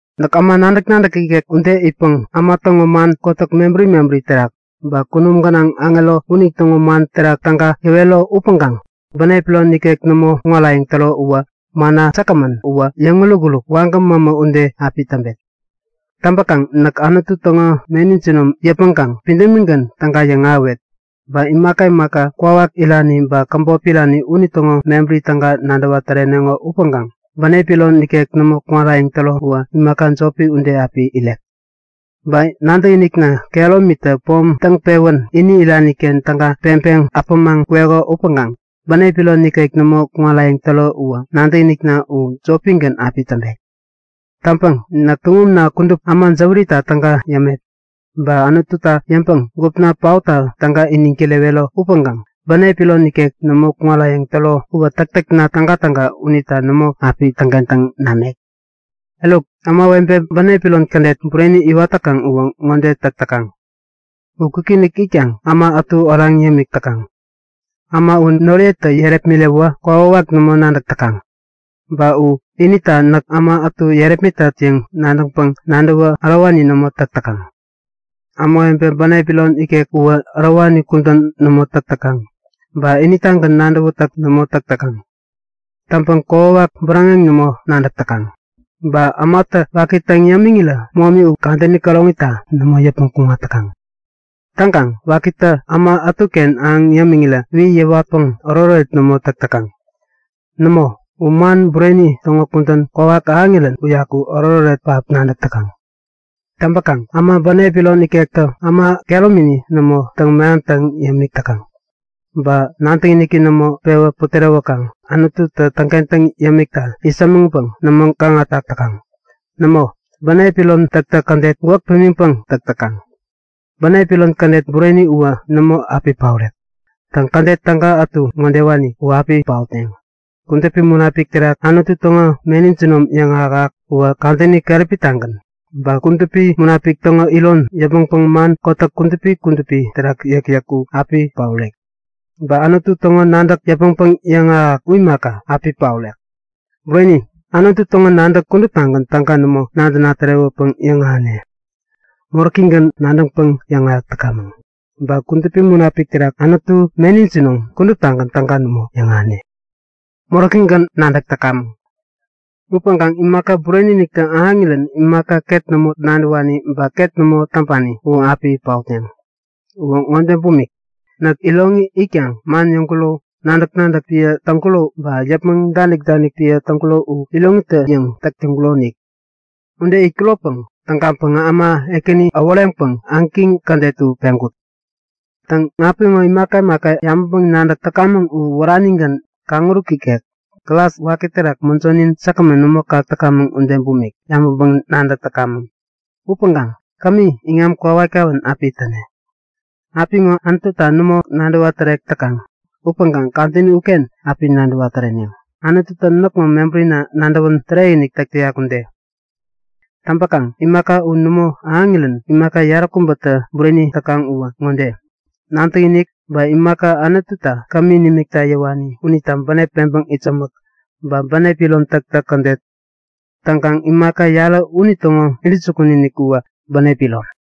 Näk äma nadäk-nadäk ikek ude itpäŋ äma täŋo man kotäk mebäri mebäri terak, ba kunum gänaŋ aŋero unitäŋo man terak täga yäwero upäŋkaŋ bänep iron ikek nämo kuŋarayäŋ täro uwä manna säkgämän uwä yäŋuruk-uruk, wagäm mämä ude api täŋpek. Täŋpäkaŋ näk Anutu täŋo meni jinom yäpmäŋkaŋ pidämigän täga yäŋahäwet, ba imaka imaka kwawak irani ba käbop irani unitäŋo mebäri täga nadäwa täreneŋo upäŋkaŋ bänep iron ikek nämo kuŋarayäŋ täro uwä imaka jopi ude api iret. Ba nadäkinikna kehäromitä pom täŋpewän ini irani-ken täga peŋpeŋ äpämaŋ kweko upäŋkaŋ bänep iron ikek nämo kuŋarayäŋ täro uwä nadäkinikna u jopigän api täŋpek. Täŋpäŋ näk tuŋumna kudup äma jäwärita täga yämet, ba Anututa yäŋpäŋ gupna paotta täga iniŋ kirewero upäŋkaŋ bänep iron ikek nämo kuŋarayäŋ täro uwä täktäkna tägatäga unitä nämo api täŋkentäŋ namek. Eruk ämawebe bänep iron kädet bureni iwat täkaŋ uwä ŋode täk täkaŋ; U kwikinik itkaŋ äma ätu oraŋ yämik täkaŋ. Äma u noriyetä yärepmiräwä kokwawak nämo nadäk täkaŋ. Ba u inita näk äma ätu yärepmitat yäŋ nadäŋpäŋ nadäwä ärowani nämo täk täkaŋ. Ämawebe bänep iron ikek uwä ärowani kudän nämo täk täkaŋ ba initagän nadäwätäk nämo täk täkaŋ. Täŋpäŋ kokwawak bäräŋeŋ nämo nadäk täkaŋ. Ba ämatä waki täŋ yämiŋirä momi u kadäni käroŋita nämo yäpmäŋ kuŋat täkaŋ. Täŋkaŋ wakitä äma ätuken ahäŋ yämiŋirän wi yäwatpäŋ oretoret nämo täk täkaŋ. Nämo, u man bureni täŋo kudän kwawak ahäŋirän uyaku oretoret pähap nadäk täkaŋ. Täŋpäkaŋ äma bänep iron ikektä äma kehäromini nämo täŋ-mehamtaŋ yämik täkaŋ. Ba nadäkiniki nämo pewä putärewäkaŋ Anututä täŋkentäŋ yämikta itsämäŋpäŋ nämo gaŋatak täkaŋ. Nämo, bänep iron täktäk kädet gwäk pimiŋpäŋ täk täkaŋ. Bänep iron kädet bureni uwä nämo api paorek. Täŋ, kädet täga ätu ŋodewani u api paotneŋ; Kudupi Munapik terak Anutu täŋo meni jinom yäŋahäk-ahäk uwä kadäni keräpi-tagän. Ba Kudupi Munapik täŋo iron yäpmäŋpäŋ man kotäk kudupi kudupi terak yäkyäk u api paorek. Ba Anutu täŋo nadäk yäpmäŋpäŋ yäŋahäk-ahäk u imaka, api paorek. Bureni, Anutu täŋo nadäk kuduptagän täga nämo nadäna tärewäpäŋ yäŋahäne, moräkigän nadäŋpäŋ yäŋahäk täkamäŋ. Ba Kudupi Munapik terak Anutu meni jinom kuduptagän täga nämo yäŋahäne, moräkigän nadäk täkamäŋ. Upäŋkaŋ imaka bureni-iniktä ahäŋirän imaka ket nämo nadäwani ba ket nämo täŋpani u api paotneŋ. Uwä ŋode bumik; Näk iroŋi itkaŋ man yäŋkuro, nadäk-nadäk piä täŋkuro ba yäpmäŋ danik-danik piä täŋkuro u iroŋitä-yäŋ täk täŋkuronik. Ude itkuropäŋ tägaŋpäŋä äma ekäni äworeŋpäŋ ägiŋ kädet u peŋkut. Täŋ, apiŋo imaka imaka yabäŋpäŋ-nadäk täkamäŋ u wäranigän kaŋuruk ikek, glas waki terak mäjonin säkgämän nämo kak täkamäŋ ude bumik yabäŋpäŋ-nadäk täkamäŋ. Upäŋkaŋ kami iŋam kowat-kawän api täne. Apiŋo Anututa nämo nadäwa tärek täkaŋ. Upäŋkaŋ kadäni uken api nadäwa täreneŋ, Anututä näkŋo mebärina nadäwän tärekinik täk täyak ude. Täŋpäkaŋ imaka u nämo ahäŋirän imaka yaräkubätä bureni täkaŋ uwä ŋode; Nadäkinik, ba imaka Anututä kämi nimikta yäwani unita bänep peŋpäŋ itsämäk, ba bänep iron täktäk kädet. Täŋkaŋ imaka yarä unitäŋo intäjukun-inik uwä bänep iron.